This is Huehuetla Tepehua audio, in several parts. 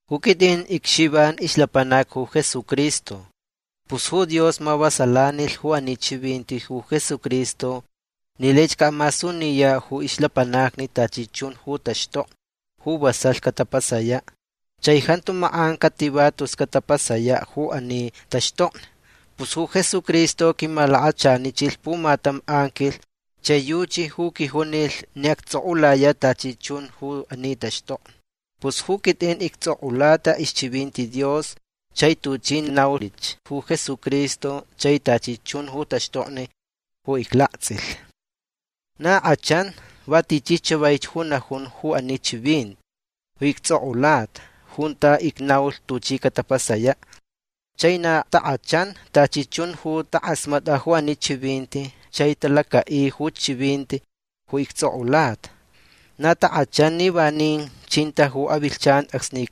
Ju quitʼin icXivan ixlapanac ju Jesucristo. Pus ju Dios mavasalanilh ju ani chivinti ju Jesucristo ni laich caʼamasuniyaʼ ju ixlapanacni tachi chun ju taxtokni ju vasalh catapasayaʼ. Chai jantu makʼan cativa tus catapasayaʼ ju ani taxtokni. Pus ju Jesucristo quimalakachanichilh pumatam anquilh chai yuchi ju quijunilh ni actsʼokʼulayaʼ tachi chun ju ani taxtokni. Pus ju quitʼin ictsokʼulata ixchivinti Dios chai tuchi naulich ju Jesucristo chai tachi chun ju taxtokni ju iclaktsʼilh. Na kʼachan va tichi chavaich ju najun ju ani chivinti ju ictsʼokʼulata junta icnaulh tuchi catapasayaʼ. Chai na takʼachan tachi chun ju takʼasmatʼa ju ani chivinti chai talacaʼi ju chivinti ju ictsʼokʼulata. Na takʼachan ni vanin chinta ju avilhchan acsni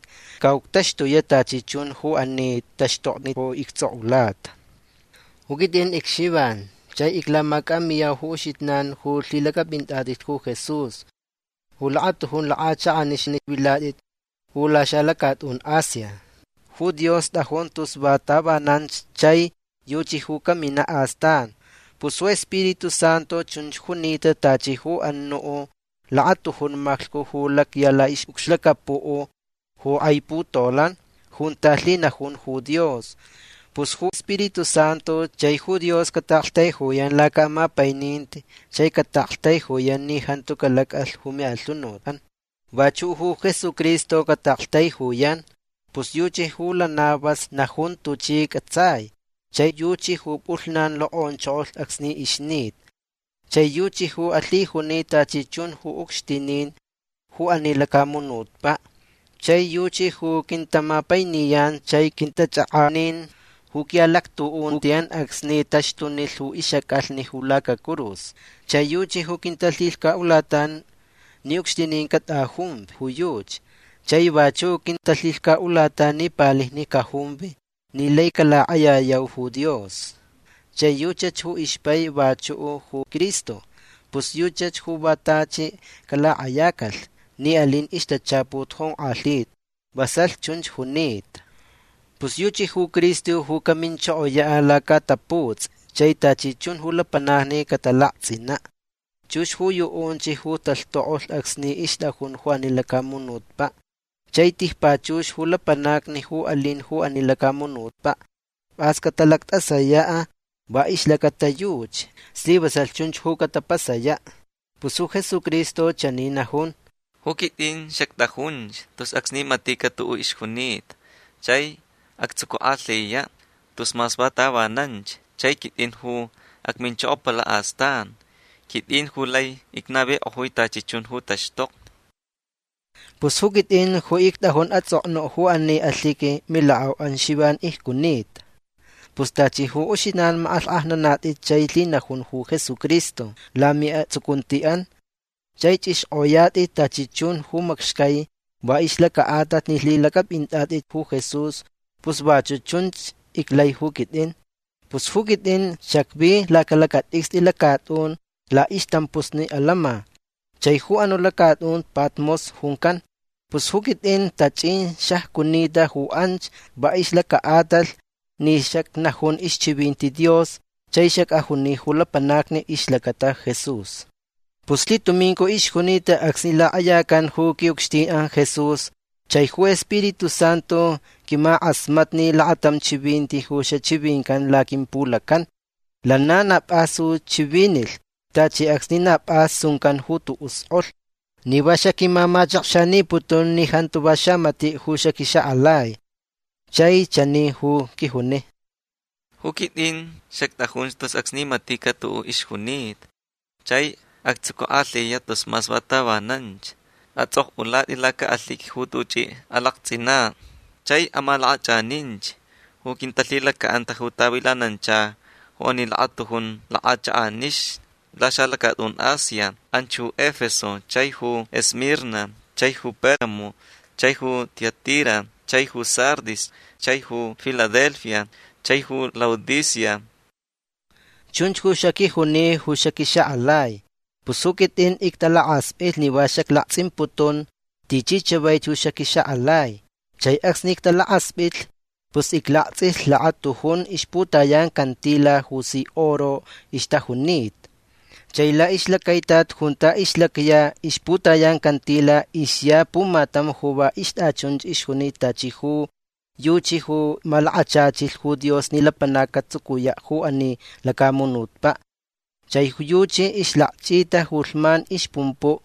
caʼuctaxtuyaʼ tachi chun ju ani taxtokni ju ictsʼokʼulata. Ju quitʼin icXivan chai iclamacʼamiyau ju uxijnan ju lhilacʼapʼinatʼit ju Jesús ju lakatujun lakʼachakʼanixni vilatʼit ju laxalacatʼun Asia. Ju Dios tʼajun tus va tavananch chai yuchi ju caminaʼ astan. Pus ju Spiritu Santu chunch junita tachi ju anuʼ lakatujun maclhcu ju lacya laʼixʼucxlacapuʼ ju kʼai putolan junta lhinajun ju Dios. Pus ju Spiritu Santu chai ju Dios cataʼaktaijuyan lacaʼamapaininti chai cataʼaktaijuyan ni jantu calacʼalh ju miʼalhunutʼan. Vachuʼ ju Jesucristo cataʼaktaijuyan. Pus yuchi ju lana vas najun tuchi cʼatsai. Chai yuchi ju pʼulhnan lokʼonchokolh acsni ixnita. Chai yuchi ju alhijuni tachi chun ju ucxtinin ju ani lacamunutpaʼ. Chai yuchi ju quintamapainiyan chai quintachʼakʼanin ju quiʼalactuʼuntiʼan acsni taxtunilh ju ixʼacʼalhni ju lacacurus. Chai yuchi ju quintalhilhcaʼulatan ni ucxtinin catʼajumvi ju yuchi. Chai vachuʼ quintalhilhcaʼulatan ni palijni cajumvi ni lai calakʼayayau ju Dios. Chai yuchach ju ixpai vachuʼ ju Cristo. Pus yuchach ju va tachi calakʼayacalh ni alin ixtachaput jonkʼalhita. Vasalh chunch junita. Pus yuchi ju Cristo ju caminchokoyaʼ lacaʼataputsʼi chai tachi chun ju lapanacni catalaktsʼinaʼ. Chux ju yuʼunch ju talhtokʼolh acsni ixtʼajun ju ani lacamunutpaʼ. Chai tijpachux ju lapanacni ju alin ju ani lacamunutpaʼ pʼas catalactʼasayaʼ va ixlacata yuchi. Slivasalh chunch ju catapasayaʼ. Pus ju Jesucristo chani najun: “Ju quitʼin xactʼajunch tus acsni maticaʼ tuʼuʼ ixjunita chai actsucukʼalhiyaʼ tus mas va tavananch. Chai quitʼin ju acminchokopalaʼ astan. Quitʼin ju lai icnavikʼojui tachi chun ju taxtokni”. Pus ju quitʼin ju ictʼajun atsʼoknuʼ ju ani alhiqui milakʼauʼan Xivan icjunita. Pus tachi ju uxijnan makʼalhkʼajnanatʼit chai lhinajun ju Jesucristo lamiʼatsucuntiʼan chai chʼixkʼoyatʼit tachi chun ju macxcai va ixlacaʼatalh ni lhilacʼapʼinatʼit ju Jesús pus vachuʼ chunch iclai ju quitʼin. Pus ju quitʼin xacvi lacalacatʼicstʼi lacatʼun laʼixtampusni alama. Chai ju anuʼ lacatʼun Patmos juncan. Pus ju quitʼin tachʼin xacjunita ju anch va ixlacaʼatalh ni xacnajun ixchivinti Dios chai xacʼajuni ju lapanacni ixlacata ju Jesús. Pus lhitumincu ixjunita acsni lakʼayacan ju quiʼucxtinʼan Jesús. Chai ju Spiritu Santu quimakʼasmatni lakatam chivinti ju xachivincan ju laquimpulacan. Lana na pʼas ju chivinilh tachi acsni na pʼas suncan ju tuʼuʼ skʼolh ni va xaquimamachakxaniputun ni jantu va xamatiʼ ju xaquixakʼalai. Chai chani ju quijuni: ―Ju quitʼin xactʼajunch tus acsni maticaʼ tuʼuʼ ixjunita chai actsucukʼalhiyaʼ tus mas va tavananch. Atsʼokʼulatʼi lacaʼalhiqui ju tuchʼi alaktsʼinaʼ. Chai amalakʼachʼaninch ju quintalhilacaʼanta ju tavilanancha ju ani lakatujun lakʼachakʼanixni laxalacatʼun Asia. Anch ju Efeso chai ju Esmirna chai ju Pérgamo chai ju Tiatira chai ju Sardis chai ju Filadelfia chai ju Laodicea. ―Chunch ju xaquijuni ju xaquixakʼalai. Pus ju quitʼin ictalakaspʼitlh ni va xaclaktsʼimputun tichi chavaich ju xaquixakʼalai. Chai acsni ictalakaspʼitlh pus iclaktsʼilh lakatujun ixputayan cantila ju si oro ixtajunita. Chai laʼixlacaitat junta ixlacya ixputayan cantila ixya pumatam ju va ixtʼachunch ixjunita tachi ju yuchi ju malakachachilh ju Dios ni lapanac catsucuyaʼ ju ani lacamunutpaʼ. Chai ju yuchi ixlakchʼita ju lhman ixpumpuʼ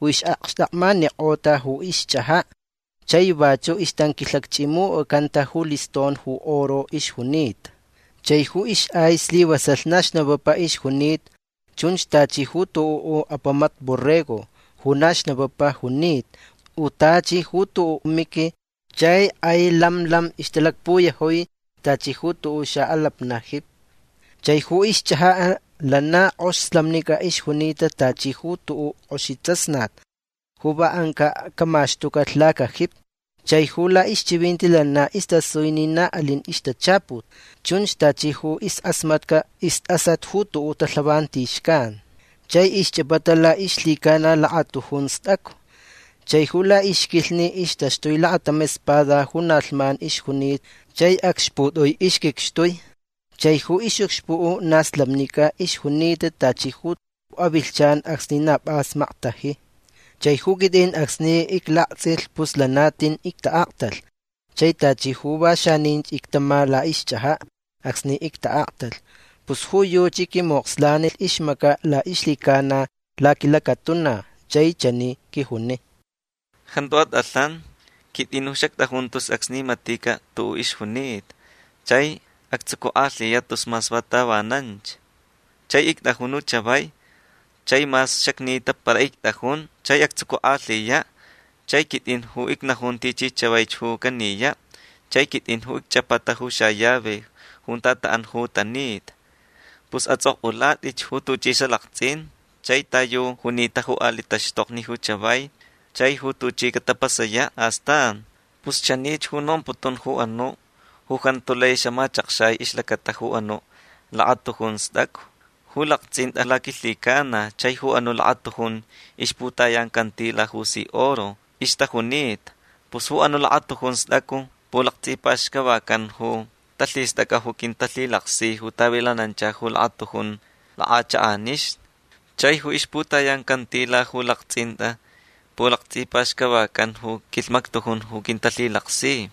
ju ixʼakxtakmanikʼota ju ixchʼajaʼ. Chai vachuʼ ixtanquilhakchʼimucʼacanta ju liston ju oro ixjunita. Chai ju ixʼai slivasalh na xnapapa ixjunita. Chun tachi ju tuʼuʼ apamat borrego ju na xnapapa junita u tachi ju tuʼuʼ miqui. Chai kʼai lam lam ixtalakpuyajui tachi ju tuʼuʼ xaʼalapnaʼ jipi. Chai ju ixchʼajaʼ lana kʼox slamnicʼa ixjunita tachi ju tuʼuʼ kʼoxi tsasnat ju va ancaʼ camaxtucalh lacajipi. Chai ju laʼixchivinti lana istasui ni na alin ju ixtachaput. Chunch tachi ju ixkʼasmatca istʼasat ju tuʼuʼ talhavanti xcan. Chai ixchʼapata laʼixlhicana lakatujun stʼacu. Chai ju laʼixquilhni ixtaxtui lakatam espada ju na lhman ixjunita chai acxputʼui ixquicxtui. Chai ju ixʼucxpuʼ na slamnicʼa ixjunita tachi ju avilhchan acsni na pʼas maktaji. Chai ju quitʼin acsni iclaktsʼilh pus lana tin ictaʼaktalh. Chai tachi ju va xanin ictama laʼixchʼajaʼ acsni ictaʼaktalh. Pus ju yuchi quimokslanilh ixmacaʼ laʼixlhicana laquilacatuna chai chani quijuni: ―Jantu atʼalhan. Quitʼin ju xactʼajun tus acsni maticaʼ tuʼuʼ ixjunita chai actsucukʼalhiyaʼ tus mas va tavananch. Chai ictʼajun ju chavai. Chai mas xacnita para ictʼajun chai actsucukʼalhiyaʼ. Chai quitʼin ju icnajun tichi chavaich ju caniyaʼ chai quitʼin ju icchʼapata ju xallave junta taʼan ju tanita. Pus atsʼokʼulatʼich ju tuchʼi xalaktsʼin chai ta yu junita ju aliʼ taxtokni ju chavai chai ju tuchi catapasayaʼ astan. Pus chanich ju nomputun ju anuʼ ju jantu lai xamachʼakxai ixlacata ju anuʼ lakatujun stʼacu ju laktsʼintʼa laquilhicana chai ju anuʼ lakatujun ixputayan cantila ju si oro ixtajunita. Pus ju anuʼ lakatujun stʼacu pulaktsʼipaxcavacan ju talhistʼacʼa ju quintalhilaksi ju tavilanancha ju lakatujun lakʼachakʼanixni. Chai ju ixputayan cantila ju laktsʼintʼa pulaktsʼipaxcavacan ju quilhmaktujun ju quintalhilaksi.